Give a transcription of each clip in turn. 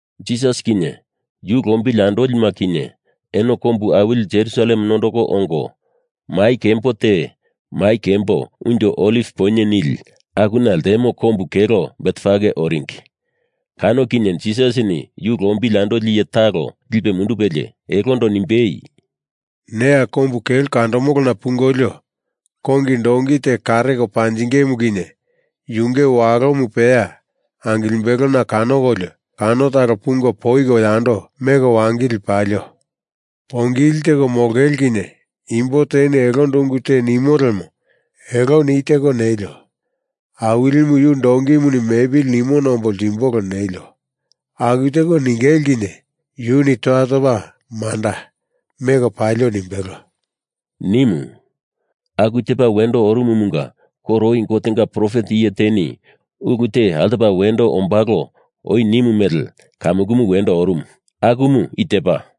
Jisas kinye yu lombili andolima kinye eno kombu awili Jerusalem nondoko ongo, mai kembo te Mai Kembo Unjo Oliv Poinye nili akuna ltemo kombu kelo Betfage oringi. Kano kinye Jisasini yu lombili andoli iye talo lipe mundupelie, elondo nimbei, “Neya kombu kelo kandomolona pungolio kongi donki te kareko panjingemu kinye yunge walomu peya angimbelena kanokolio kano talo pungo poiko yando meko wangili palio. Poingili teko molongele kinye imbo teni elondo ungu te nimo lemo eloni i teko ningili ‘Awilimu yu donkimuni mepili nimona ombo ltimbolo,’ nelio. Aku teko ningele kinye yuni toya topa manda, meko palio nimbelo,” nimu. Aku tepa wendo orumumunga koro oi Gotenga profet iye teni ulu te altopa wendo ombalo oi nimu mele kamukumu wendo orumu. Akumu i tepa,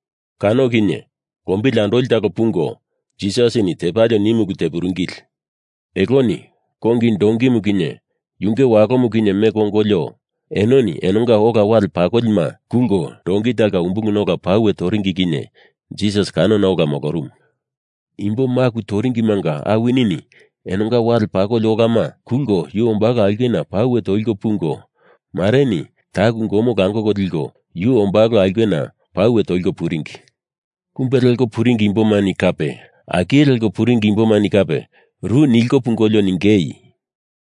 Kano kinye lombili andoli talo pungo Jisasini tepalio nimu ulu tepuringili. Eloni kongi donkimu kinye yunge walomu kinye meko ongolio, enoni enonga ola wale pakolima kulko donki talonga umbuluna ola pauwe toringi kinye Jisas kanona ola molorumu. Imbo maku toringimanga awinini enonga wale pakoli olama kulko yu ombalo aulkena pauwe toliko pungo, mareni taku gomo langoko liko yu ombalo aulkena pauwe toliko puringi. Kumbe leko puringi imbomani kape akilko puringi imbomani kape ru niliko pungolio ningei,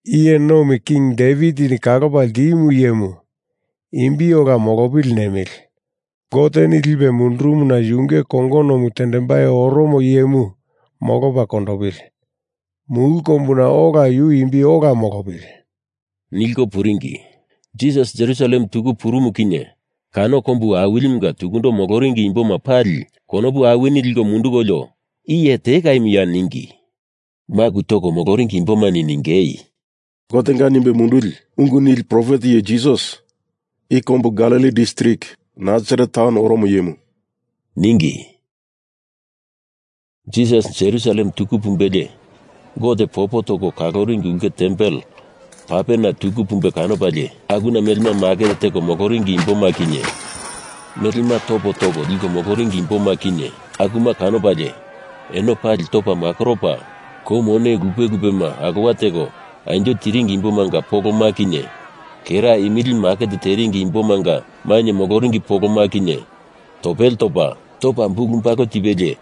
Iye Nomi King Devitini Kalopa Ltimu Iyemu imbi ola molopili nemili. Goteni lipe mundurumuna yunge kongonomu tendembai oromo iyemu molopa kondopili. Mulu kombuna ola yu imbi ola molopili, nilko puringi. Jisas Jerusalem tuku purumu kinye kano kombu awilimunga tukundo moloringi imboma pali konopu awini liko mundukolio iye tekaimuya ningi. Maku toko moloringi imbomani ningei, “Gotenga nimbe munduli ungu nili profet iye Jisas, i kombu Galili distrik Nasaret taun oromo iyemu,” ningi. Jisas Jerusalem tuku pumbelie Gote popo toko kaloringi ulke tempel papena tuku pumbe kanopalie akuna melema maket teko moloringi imboma kinye, melema topo toko liko moloringi imboma kinye akuma kanopalie eno pali topa makoropa, kou mone lupe lupema alowa teko anjo tiringi imbomanga poloma kinye, kera imili maket teringi imbomanga mainye moloringi poloma kinye, topele topa, topa bulubalu tipelie,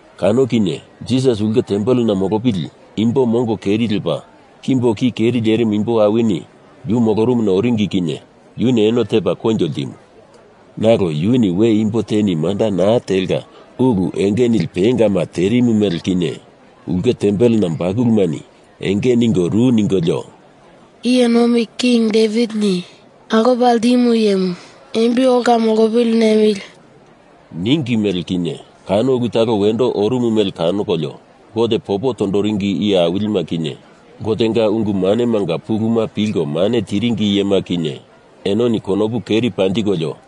Kano kinye Jisas ulke tempelena molopili imbo mongo keri lepa, kimbo ki keri lerimu imbo awini yu molorumuna oringi kinye yuni eno tepa koinjo ltimu. Nalo yuni we imbo teni manda naa telka ulu enge nili pengama terimu mele kinye, ulke tempelena bakulumani enge ningo ru ningolio, “Iye Nomi King Devitini Kalopa Ltimu Iyemu imbi ola molopili nemili,” ningi mele kinye, kano ulu talo wendo orumu mele kanokolio Gote popo tondoringi iye awilima kinye Gotenga ungu manemanga puluma pilko mane tiringi iyema kinye enoni konopu keri panjikolio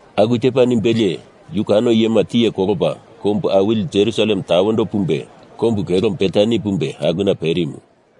Aku tepa nimbelie yu kano iyema tiye kolopa kombu awili Jerusalem tawendo pumbe kombu kelo Betani pumbe akuna perimu.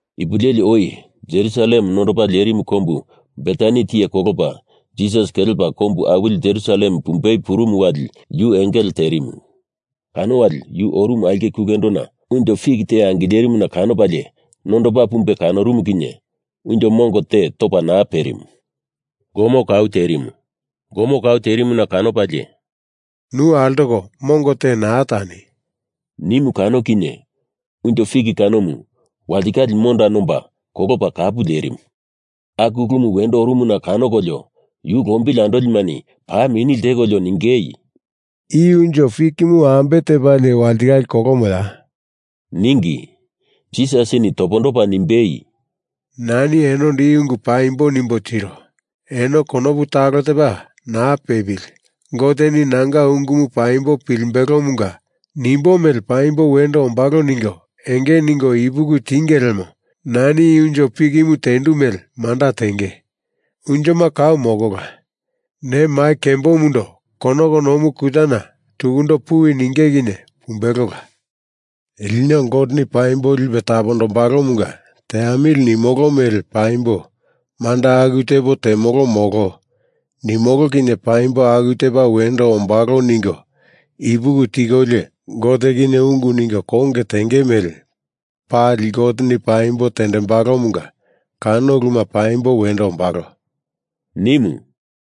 Ipu leli oi Jerusalem nondopa lerimu kombu Betani tiye kolopa Jisas kelepa kombu awili Jerusalem pumbei purumu wali yu engele terimu. Kano wali yu orumu aulke kulendona unjo fik te angilerimuna kanopalie nondopa pumbe kanorumu kinye unjo mongo te topa naa perimu, gomo kau terimu. Gomo kau terimuna kanopalie “Nu altoko mongo te naa tani,” nimu kinye unjo fik kanomu walitikale monda nomba kolopa kapu lerimu. Aku ulumu wendo orumuna kanokolio yu lombili andolimani paa mini ltekolio ningei, “I unjo fikimu ambe tepalie walitikale kolomoya?” ningi. Jisasini topondopa nimbei, “Nani enondo i ungu paimbo nimbo tiro. Eno konopu talo tepa naa pepili Goteni nanga ungumu paimbo pilimbelomunga nimbo mele paimbo wendo ombalo ningo enge ningo ipuki tiengei lemo nani i unjo fikimu tendu mele manda tenge. Unjoma kau molola. Ne mai kembomundo konoko nomu kutana tukundo puwi ninge kinye pumbelola. Lino Goteni paimbo lipe tapombalomunga teamili nimolo mele paimbo manda aku tepo temolo molo nimolo kinye paimbo aku tepa wendo ombalo ningo ipuki tikolio Gote kinye ungu ningo konge tenge mele pali Goteni paimbo tendembalomunga kano uluma paimbo wendo ombalo,” nimu.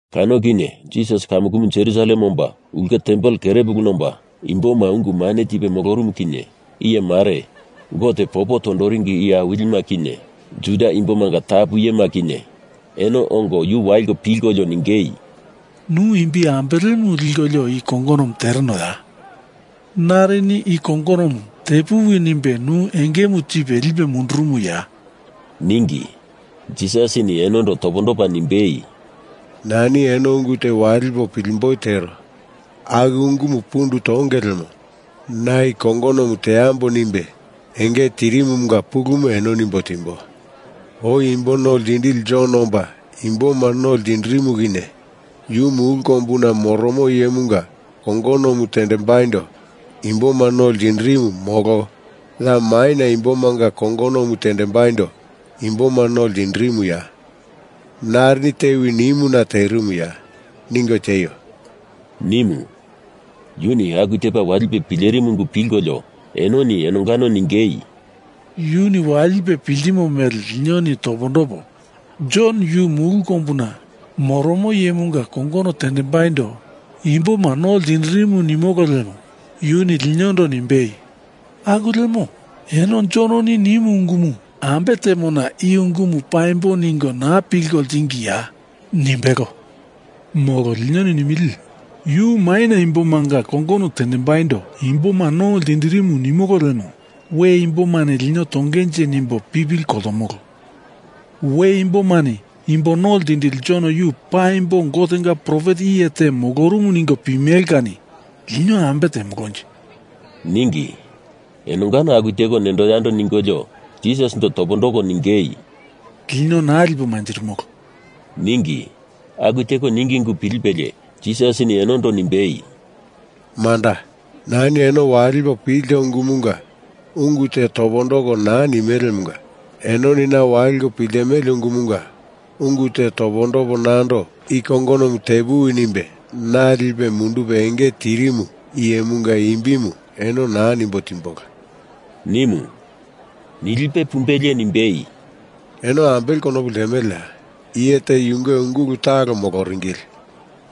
Kano kinye Jisas kamukumu Jerusalem omba ulke tempel kerepuluna omba, imboma ungu mane tipe molorumu kinye iye mare, Gote popo tondoringi iye awilima kinye, Juda imbomanga tapu iyema kinye eno ongo yu waliko pilkolio ningei, “Nu imbi ambelemu likolio i kongonomu teronoya? Narini i kongonomu tepuwi nimbe nu engemu tipe lipe mundurumuya?” ningi. Jisasini enondo topondopa nimbei, “Nani eno ungu te walipo pilemboi tero. Aku ungumu pundu tonge lemo na i kongonomu teambo nimbe enge tirimumunga pulumu eno nimbo timbo. Oi Imbo No Ltindili Jon omba imboma no ltindirimu kinye, yu mulu kombuna moromo iyemunga kongonomu tendembaindo imboma no ltindirimu molo ya maina imbomanga kongonomu tendembaindo imboma no ltindirimuya? Narini tewi nimuna terimuya? Ningo tieio,” nimu. Yuni aku tepa walipe pilerimu ungu pilkolio enoni enongano ningei, “Yuni walipe piltimo mele linoni topondopo, Jon yu mulu kombuna moromo iyemunga kongono tendembaindo imboma no ltinderimu nimolo lemo yuni linondo nimbei, ‘Aku lemo eno Jononi nimu ungumu ambe temona i ungumu paimbo ningo naa pilko ltingiya?’ nimbelo. Molo linoni nimili, ‘Yu maina imbomanga kongono tendembaindo imboma no ltinderimu’ nimolo lemo we imbomani lino tongenje nimbo pipili koltomolo. We imbomani imbo no ltindili Jon yu paimbo Gotenga profet iye te molorumu ningo pimele kani lino ambe temolonje?” ningi. Enongano aku teko nendo yando ningolio, Jisasindo topondoko ningei, “Lino naa lipo manjirimolo,” ningi. Aku teko ningi ungu pilipelie Jisasini enondo nimbei, “Manda. Nani eno walipo pilto ungumunga ungu te topondoko naa nimelemunga enoni na waliko piltimele ungumunga ungu te topondopo nando i kongonomu te puwi nimbe na lipe mundupe enge tirimu iyemunga imbimu eno naa nimbo timbola,” nimu. Nilipe pumbelie nimbei, “Eno ambele konopu ltemeleya? Iye te yunge ungulu talo moloringili.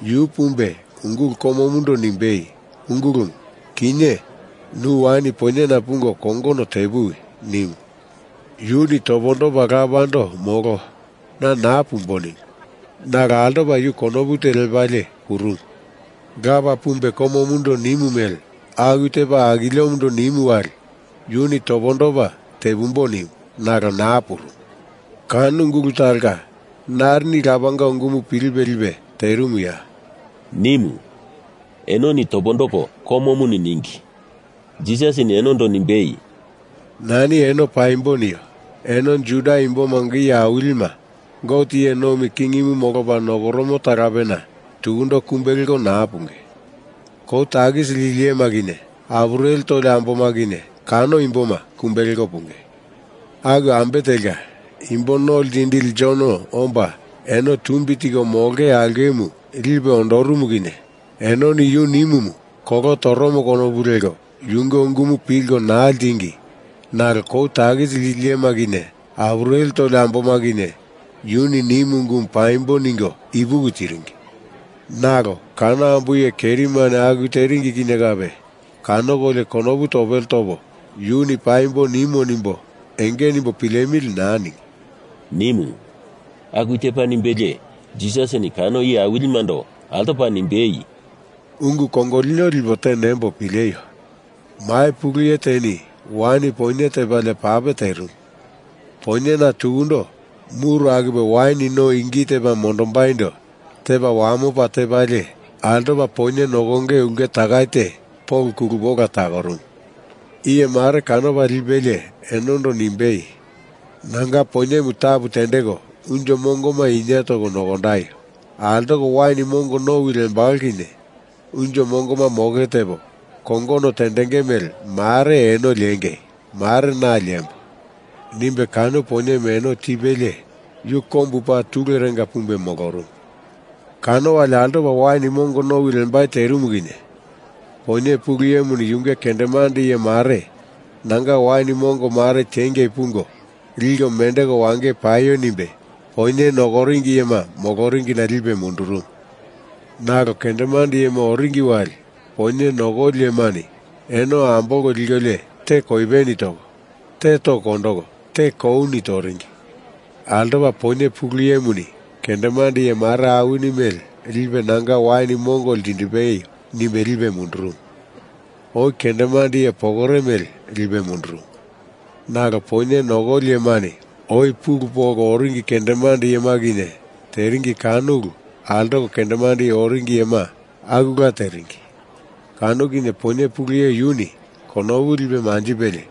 Yu pumbe ungulu komomundo nimbei, ‘Ungulumu, kinye nu wain poinyena pungo kongono te puwi,’ nimu. Yuni topondopa lapando molo, na naa pumbo nimu, nalo altopa yu konopu te lepalie purumu. Lapa pumbe komomundo nimu mele aku tepa akiliomundo nimu wali yuni topondopa tepumbo nimu, nalo naa purumu. Kano ungulu talonga narini lapanga ungumu pilipe lipe terimuya?” nimu. Enoni topondoko komomuni ningi. Jisasini enondo nimbei, “Nani eno paimbo nio. Eno Juda imbomanga iye awilima Gote iye nomi kingimu molopa nokoromo talapena tukundo kumbe leko naa punge. Kou takisi lili iyema kinye apureli toli amboma kinye kano imboma, kumbe leko punge. Aku ambe telka Imbo No Ltindili Jon omba eno tumbi tiko molonge aulkemu lipe ondorumu kinye enoni yu nimumu kolo toromo konopu leko yunge ungumu pilko naa ltingi nalo kou takisi lili iyema kinye apureli toli amboma kinye yuni nimu ungumu paimbo ningo ipuki tiringi. Nalo kano ambo iye kerimani aku teringi kinye kape kanokolio konopu topele topo yuni paimbo nimo nimbo enge nimbo pilemili naa ningi,” nimu. Aku tepa nimbelie Jisasini kano iye awilimando altopa nimbei, “Ungu kongolino lipo te nembo pileio. Mai pulu iye teni wain poinye tepalie pape terimu. Poinyena tukundo muru akupe wain no ingi tepa mondombaindo tepa wamopa tepalie, altopa poinye nokonge ulke takai te polo kulupe ola takorumu. Iye mare kanopa lipelie enondo nimbei, ‘Nanga poinyemu tapu tendeko unjo mongoma inie toko nokondaio. Altoko wain mongo nowi lembalo kinye unjo mongoma moke tepo, kongono tendenge mele mare eno liengei mare na liembo,’ nimbe kano poinyemu eno tipelie yu kombu paa tulerenga pumbe molorumu. Kano wali altopa wain mongo nowi lembai terimu kinye poinye pulu iyemuni yunge kendemande iye mare nanga wain mongo mare tiengei pungo liko mendeko wangei paio nimbe poinye nokoringi iyema moloringina lipe mundurumu. Nalo kendemande iyema oringi wali poinye nokoli iyemani eno ambolko likolio te koipeni toko, te toko kondoko, te kouni toringi. Altopa poinye pulu iyemuni kendemande iye mare awini mele lipe nanga wain mongo ltindipeio nimbe lipe mundurumu, oi kendemande iye pokore mele lipe mundurumu. Nalo poinye nokoli iyemani oi pulu polko oringi kendemande iyema kinye teringi kano ulu altoko kendemande oringi iyema akula teringi. Kano kinye poinye pulu iye yuni konopu lipe manjipelie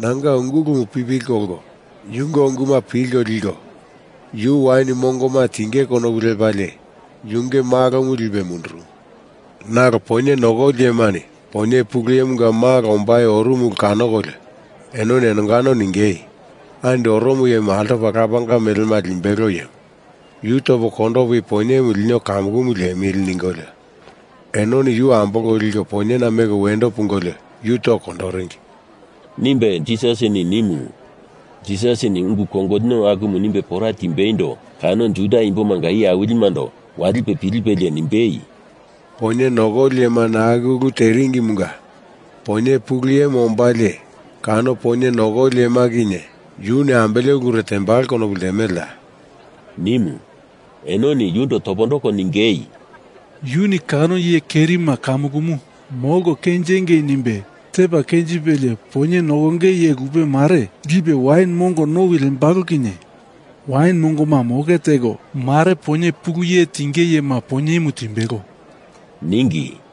nanga ungulumu pipili kolko yunge unguma pilko liko, yu wain mongoma tinge konopu lepalie yunge malomu lipe mundurumu. Nalo poinye nokoli iyemani poinye pulu iyemunga malo ombai orumu ulu kanokolio enoni enongano ningei, ‘Andi oromo iyemu altopa lapanga melema limbelo iyemu. Yu topo kondopo i poinyemu lino kamukumu liemili,’ ningolio enoni yu ambolko liko poinyena meko wendo pungolio yu toko kondoringi,” nimbe Jisasini nimu. Jisasini ungu kongolino akumu nimbe pora timbeindo kano Juda imbomanga iye awilimando walipe pilipelie nimbei, “Poinye nokoli iyemani aku ulu teringimunga poinye pulu iyemu ombalie kano poinye nokoli iyema kinye yuni ambele ulure tembalo konopu ltemeleya?” nimu. Enoni yundo topondoko ningei, “Yuni kano iye kerima kamukumu molko kenjengei nimbe tepa kenjipelie poinye nokonge iye lupe mare lipe wain mongo nowi lembolo kinye wain mongoma moke teko, mare poinye pulu iye tinge iyema poinyemu timbelo,” ningi.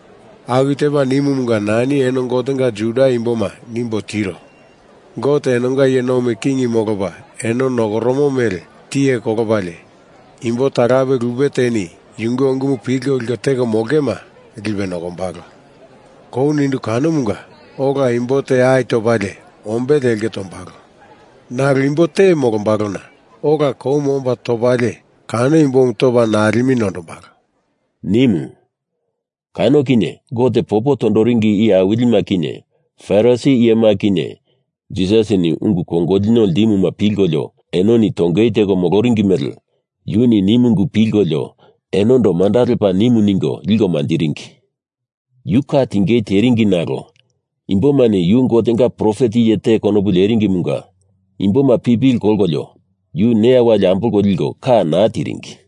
Aku tepa nimumunga nani eno Gotenga Juda imboma nimbo tiro. Gote enonga iye nomi king molopa eno nokoromo mele tiye kolopalie, imbo talape lupe teni yunge ungumu pilko liko teko molongema lipe nokombalo. Kou nindu kanomunga ola imbo te ai topalie ombele elke tombalo. Nalo imbo te molombalona ola koumu omba topalie kano imbomu topa nalemu nondombalo,” nimu. Kano kinye Gote popo tondoringi iye awilima kinye Farisi iyema kinye Jisasini ungu kongolino ltimuma pilkolio enoni tongei teko moloringi mele yuni nimu ungu pilkolio enondo manda lepa nimu ningo liko manjiringi. Yu ka tingei teringi nalo imbomani yu Gotenga profet iye te konopu leringimunga imboma pipili kolkolio yu neya wali ambolko liko ka naa tiringi.